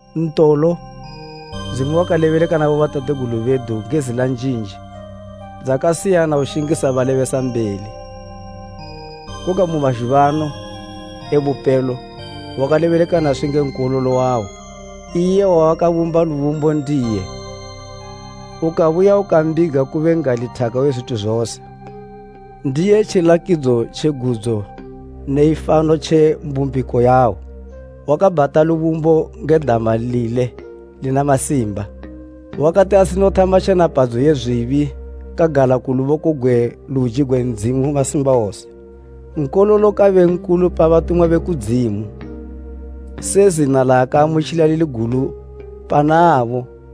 Ntolo, Ndzimu wakalebeleka na bobatategulu bedu nge zila njinji dzakasiyana ushingisa balebesambeli, koga mu mazhuba ano e bupelo wakalebeleka naswi nge Nkololo wawo, iye wawakabumba lubumbo ndiye ukabuya ukambiga kube n'gali thaka we zwithu zose. Ndiye tjilakidzo tje gudzo ne ifano tje mbumbiko yawo. Wakabhata lubumbo nge dama lile lina masimba. Wakati asinothama tjenapadzo ye zwibi kagala ku luboko gwe luji gwe Ndzimu Masimbawose. Nkololo kabe nkulu pa batumwa be kudzimu, se zina laakamutjila lili gulu pana abo,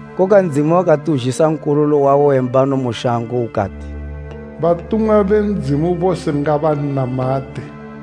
Koga Ndzimu wakati uzhisa Nkololo wawo we mbano mu shango, ukati, “Batumwa be Ndzimu bose ngabannamate.”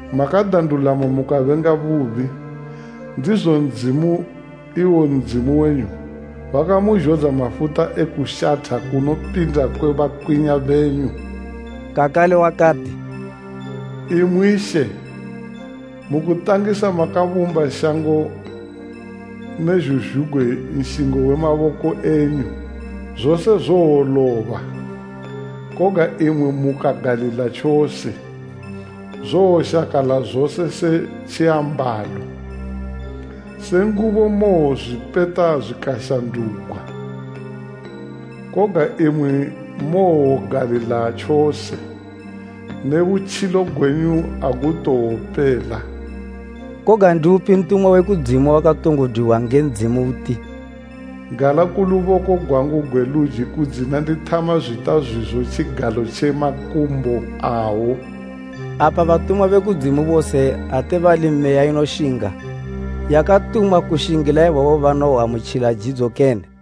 Makada ndulamo mukabenga bubi; ndizo Ndzimu, iwo Ndzimu wenyu, wakamuzhodza mafuta e kushatha kunopinda kwe bakwinya benyu.” Kakale wakati, “Imwi, She, mu kutangisa makabumba shango, ne zhuzhugwi nshingo we maboko enyu. Zose zowoloba, koga imwi mukagalila tjose, zowoshakala zose se tjiambalo. Se ngubo mowozwipeta zwikashandugwa. Koga imwi mowogalila tjose, ne butjilo gwenyu agutowopela.” Koga ndi upi ntumwa we kudzimu wakatongo dwiwa nge Ndzimu uti, “Gala ku luboko gwangu gwe luji kudzina ndithama zwita zwizo tjigalo tje makumbo awo.” Apa batumwa be kudzimu bose ate bali meya inoshinga, yakatumwa kushingila ibabo banowoamutjila jidzo kene?